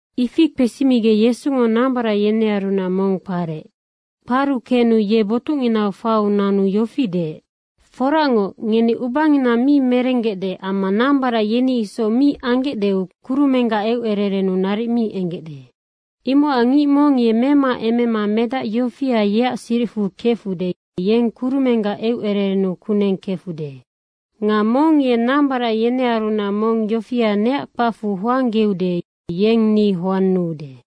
Ifi kpesimigec Yesungo nambarac yenearunac mong kparec. Kparu kenu ye botucnginau faiu nanu yofi deec, “Foracngoc, ngeni ubangina mi merenggecde amma nambarac yeni isoc mi anggecdeu kurumenggac eucererennu naric mi enggecde. Imocac ngic mong ye memaemema medac yofia, yeac siricfu kefude, yeng kurumenggac eucererennu kuneng kefude. Nga mong ye nambarac yenearunac mong yofia neac kpacfu hoanggeude, yeng ni hoannuude.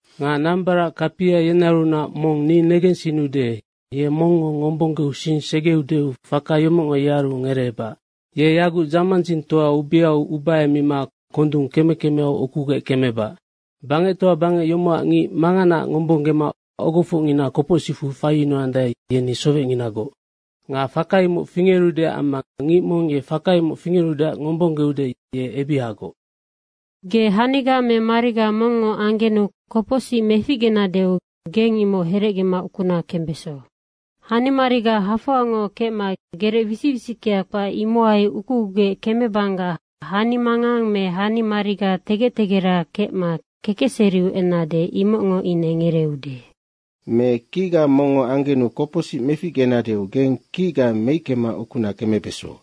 Nga nambarac kapia yenearunac mong ni negensinnude, ye mongngo ngombonggeu sing segeudeu faka yomocngo yearu ngereebac. Ye yagucnoc dzamandzingtoa ubiau ubahemima kondung keme kemeau ukugec kemebac. Bangectoa bangec yomocac ngic manganaac ngombonggema ogofocngina kopocsicfu faiyunuandae, yeni sowecnginagoc. Nga faka imoc fingerude, amma ngic mong ye faka imoc fingerudeac ngombonggeude, ye ebihagoc. Ge haniga me mariga mongngo anggenu kopocsic meficgenadeu geng imoc herecgema ukuna kembeso. Hanimariga hafoangoc kecma gerec wisic wisickea kpac, imohai ukugugec kemebanggac, hani mangang me hanimariga tegec tegera kecma kekecseriu ennade, imoc ine ngereeude. Me kicga mongngo anggenu kopocsic meficgenadeu geng kicga meickema ukuna kembeso.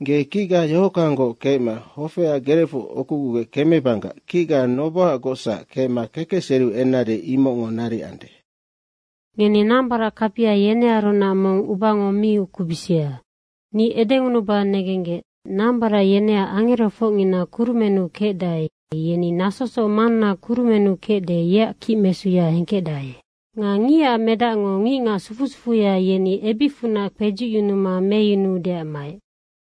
Ge kicga yohockanggoc kecma hofeac gerecfu ukugugec kemebanggac kicga nobohagocsac kecma kekecseriu ennade, imoc naric anude. Ngeni nambarac kapia, yenearunac mong ubango mi ukubisia. Ni edengunuba negenggec, nambarac yeneac angerofocngina kurumennu kecdae, yeni nasosoc Manna kurumennu kecde, yeac kicmesuya hengkecdae. Nga Ngicac Medacngo ngicngac sufu sufuya, yeni ebicfunac kpedzucyunuma meyunuudeac maec.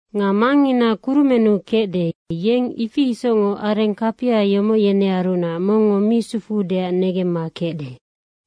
Nga Mangngina kurumennu kecde, yeng ifi isocngoc areng kapia yomoc, yenearunac mongngo mi sufuudeac negemma kecde.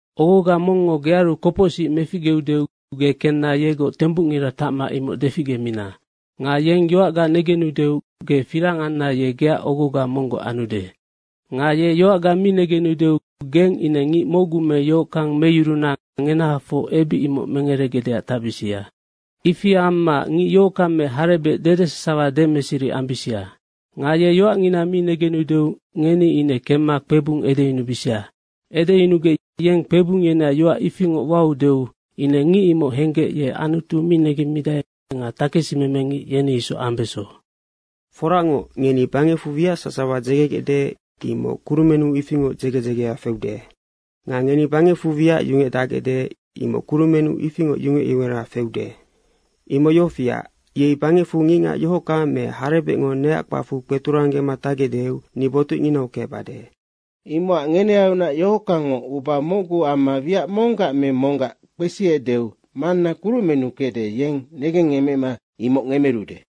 Ogoga mongngo gearu kopocsic meficgeudeu ge kenna yegoc tembucngira tacma imoc deficgemina. Nga yeng yoacga negenudeu ge firang anna ye geac ogoga monggoc anude. Nga ye yoacga mi negenudeu geng ine ngic mocgu me yohockang meyuruna ngenahafoc ebic imoc mengeregecdeac tacbisia. Ifi amma ngic yohockang me harebec dede sasawa demeseri ambisia. Nga ye yoacngina mi negenudeu ngeni ine kemma kpebung edeyunubisia. Edeyunugec yeng kpebung yeneac yoac ifingoc waudeu ine ngic imoc henggec ye ngic Anutu mi negemmidae nga takesimemengic, yeni isoc ambeso. Foracngoc, ngeni bangecfu wiac sasawa dzegegecde, imoc kurumennu ifingoc dzege dzegea feude. Nga ngeni bangecfu wiac yungecdacgecde, imoc kurumennu ifingoc yungec yungera feude. Imoc yofiac, yei bangecfu ngicngac yohockang me harebecngo neac kpacfu kpeturanggema tacgecdeu ni botucnginau kecbade. Imocac ngenearunac yohockangngo uba mocgu amma wiac monggac me monggac kpesiecdeu Manna kurumennu kecde, yeng negengngecmema imoc ngemerude.”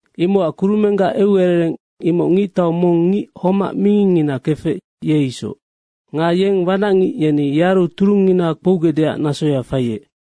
Imocac kurumenggac eucerereng imoc ngictau mong ngic homac mingingngina kefec, ye isoc. Nga yeng wanacngic yeni yearu turungngina kpougecdeac nasoya faiec.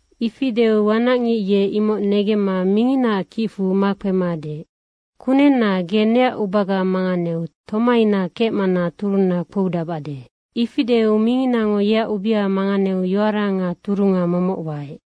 Ifi deu wanacngic ye imoc negemma minginaac kicfu makpema deec, ‘Kunenna, ge neac ubaga manganeu tomaina kecmana turunna kpoudacbade.’ Ifi deu minginango yeac ubea manganeu yoara nga turunga momoc waec.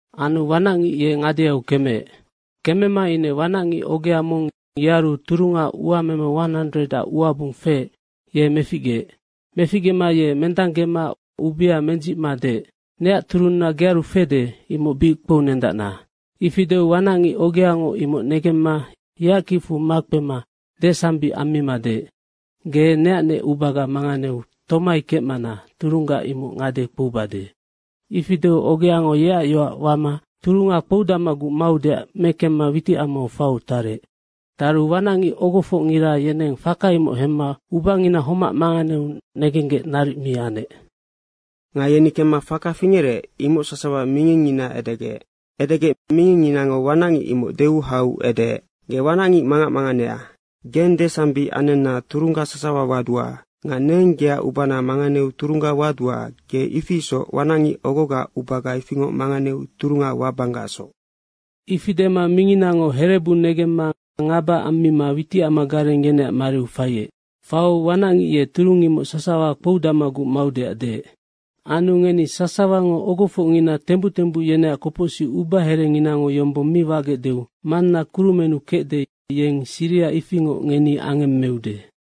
Anu wanacngic ye ngadeau kemeec. Kemema ine wanacngic ogea mong yearu turunga uameme 100ac uabung feec, ye meficgeec. Meficgema ye mendanggema ubea mendzicma deec, ‘Neac turunna gearu fede, imoc bic kpounendacna.’ Ifi deu wanacngic ogeango imoc negemma yeac kicfu makpema desambic ammima deec, ‘Ge neacnec ubaga manganeu tomai kecmana turungga imoc ngade kpoubade.’ ifi deu ogeango yeac yoac wama turunga kpoudacmaguc maudeac mekemma witicamau faiu tarec. Taru wanacngic ogofocngira yeneng faka imoc hemma ubangina homac manganeu negenggec naric mi anec. Nga yeni kemma faka fingerec, imoc sasawa mingingngina edegec. Edegec mingingnginango wanacngic imoc deu hau edeec, ‘Ge wanacngic mangac manganea. Geng desambic anenna turungga sasawa wadua. Nga neng geac ubana manganeu turungga wadua, ge ifi isoc wanacngic ogogaac ubaga ifingoc manganeu turunga wabanggacsoc.’ Ifi dema minginango herebu negemma ngaba ammima witicamagareng yeneac mariu faiec. Faiu wanacngic ye turung imoc sasawa kpoudacmaguc maudeac deec. Anu ngeni sasawango ogofocngina tembuc tembuc yeneac kopocsic ubaherenginango yombong mi wagecdeu Manna kurumennu kecde, yeng siriha ifingoc ngeni angemmeude.”